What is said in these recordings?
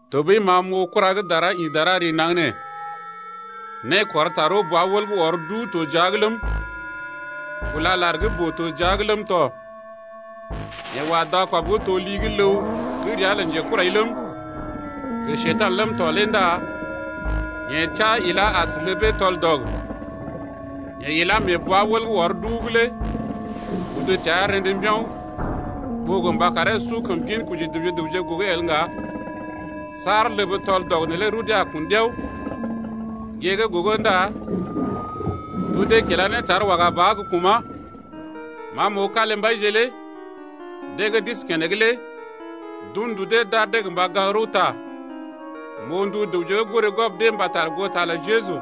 Tɔɓəi ma m’oo kura gə́ dara ḭ dara ree naŋg nee. Nékɔr tarəw bwa-wəl gə́ ɔr duu to jia’g ləm, kúla lar gə́ boo to jia’g ləm tɔ. Yeḛ wa dakɔb gə́ to li gə́ ləw gə́ ria lə njekurai ləm, gə Njeyèr ləm to lé ndá yeḛ teá ilá as ləbee tɔl-dɔg. Yeḛ ilá mee bwa-wəl gə́ ɔr duu’g lé udu təa rḛdə mbiao̰ ɓó gə mba karee su kəm ginkoji dəwje gə raŋg gogo el ŋga saar ləb tɔl-dɔg neelé rudee a kun ɗiao. Gée gə́ gogo ndá tudee kilá ne tar waga ba ɓa gə́ kuma̰. Ma m’oo kalimbaije lé, deḛ gə́ d’isi keneŋ lé d’un ndu dee d’ar dee gə mba gaŋg rəwta. M’oo ndu dəwje gə́ goré gwɔb dee mbata goo ta lə Jeju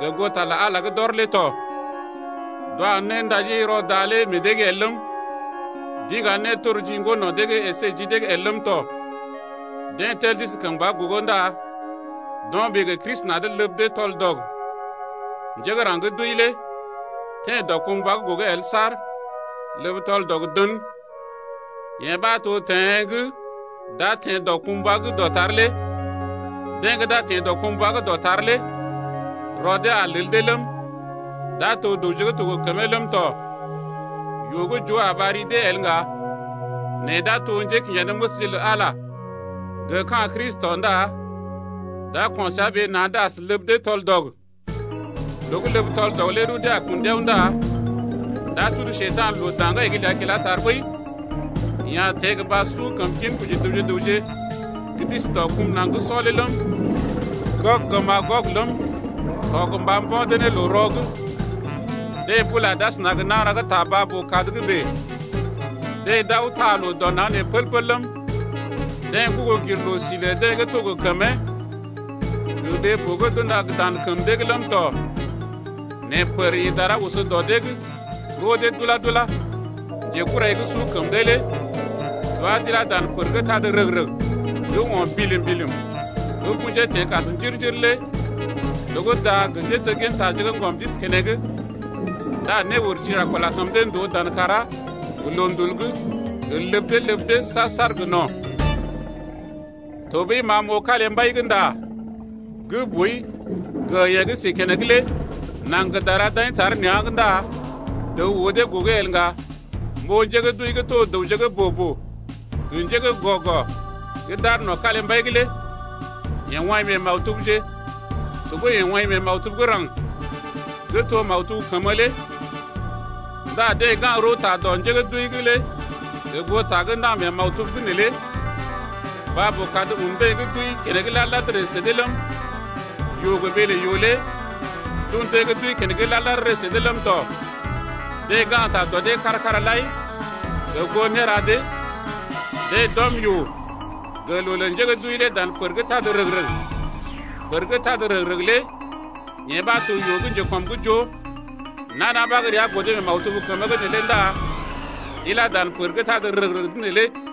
gə goo ta lə Ala gə́ d’ɔr lé tɔ. D’wa néndaji rɔ da lé meḛ dee’g el ləm, d’iŋga nétorji ŋgo no̰ dee’g əsé ji dee’g el ləm tɔ. Deḛ tel d’isi kəmba gogo ndá d’o̰ ɓee gə Kristi na̰’d ləb dee tɔl-dɔg. (Njé gə́ raŋg gə́ d’wəi lé teḛ dɔkumbwa’g gogo el saar ləb tɔl-dɔg dən.) Yee ɓa to teḛ gə́ d’a teḛ dɔkumbwa gə́ dɔtar lé. Deḛ gə́ d’a teḛ dɔkumbwa gə́ dɔtar lé rɔ dee a lel dee ləm, d’a to dəwje to gə́ gə kəmee ləm tɔ. Yoo gə́ joo a ɓar ri dee el ŋga, nɛ d’a to njékinjanéməsje lə Ala gə ka̰ Kristi tɔ ndá d’a ko̰ səa ɓee na̰’d as ləb dee tɔl-dɔg. Loo gə́ ləb tɔl-dɔg lé rudee a kun ɗiao ndá d’a tudu Njekurai loo daŋgai’g ləa kilá tar ɓəi. Yeḛ a teḛ gə mba su kəm ginkoji dəwje gə raŋg gə́ d’isi dɔ kum naŋg gə́ sɔ’g lé ləm, Gɔg gə Magɔg ləm tɔ gə mba mbo̰ dee ne loo-rɔ’g. Deḛ bula d’asəna gə nagəra gə́ ta baa-boo-kad’g bèe. Deḛ d’aw taa loo dɔ naŋg nee pəl-pəl ləm, deḛ gugu gir loo-si lə deḛ gə́ to gə kəmee gə ɓee-boo gə́ d’unda dan kəm dee’g ləm tɔ. Nɛ pər ḭ dara oso dɔ dee’g roo dee dula-dula. Njekurai gə́ su kəm dee lé d’wá d’ilá dan pər gə́ tad rəg-rəg gə́ o̰ bilim-bilim gə́ kṵjee teḛ kas njir-njir lé loo gə́ da gə njéteggintaje gə́ ŋgɔm d’isi keneŋ. Ndá néurti a kula kəm dee ndòo dan kàrá gə loondul’g gə ləb dee ləb dee saar-saar gə no̰. Tɔɓəi ma m’oo kalimbai gə́ nda gə́ boi gə yeḛ gə́ si keneŋ lé. Naŋg gə dara d’aḭ tar nea̰’g ndá dəw oo dee gogo el ŋga. M’oo njé gə́ d’wəi gə́ to dəwje gə́ boo-boo gə njé gə́ gɔ-gɔ gə́ d’aar no̰ kalimbai’g lé. Yeḛ woḭ mee maktubje, tɔɓəi yeḛ woḭ mee maktub gə́ raŋg’d, yeḛ gə́ to maktub kəmə lé. Ndá deḛ gaŋg rəwta dɔ njé gə́ d’wəi’g lé gə goo ta gə́ ndaŋg mee maktubje’g neelé. Baa-boo-kad un deḛ gə́ d’wəi keneŋ lad-lad ree sə dee ləm, yoo gə ɓee lə yoo lé d’un deḛ gə́ d’wəi keneŋ lad-lad ree sə dee ləm tɔ. Deḛ gaŋgta dɔ dee’g kára-kára lai gə goo néra dee. Deḛ d’ɔm yoo gə loo lə njé gə́ d’wəi lé dan pər gə́ tad rəg-rəg. Pər gə́ tad rəg-rəg lé yee ɓa to yoo gə́ njekɔm’g joo lé. Nana ɓa gə́ ria godo mee maktub kəmə’g neelé ndá d’ilá dan pər gə́ tad rəg-rəg’d neelé tɔ.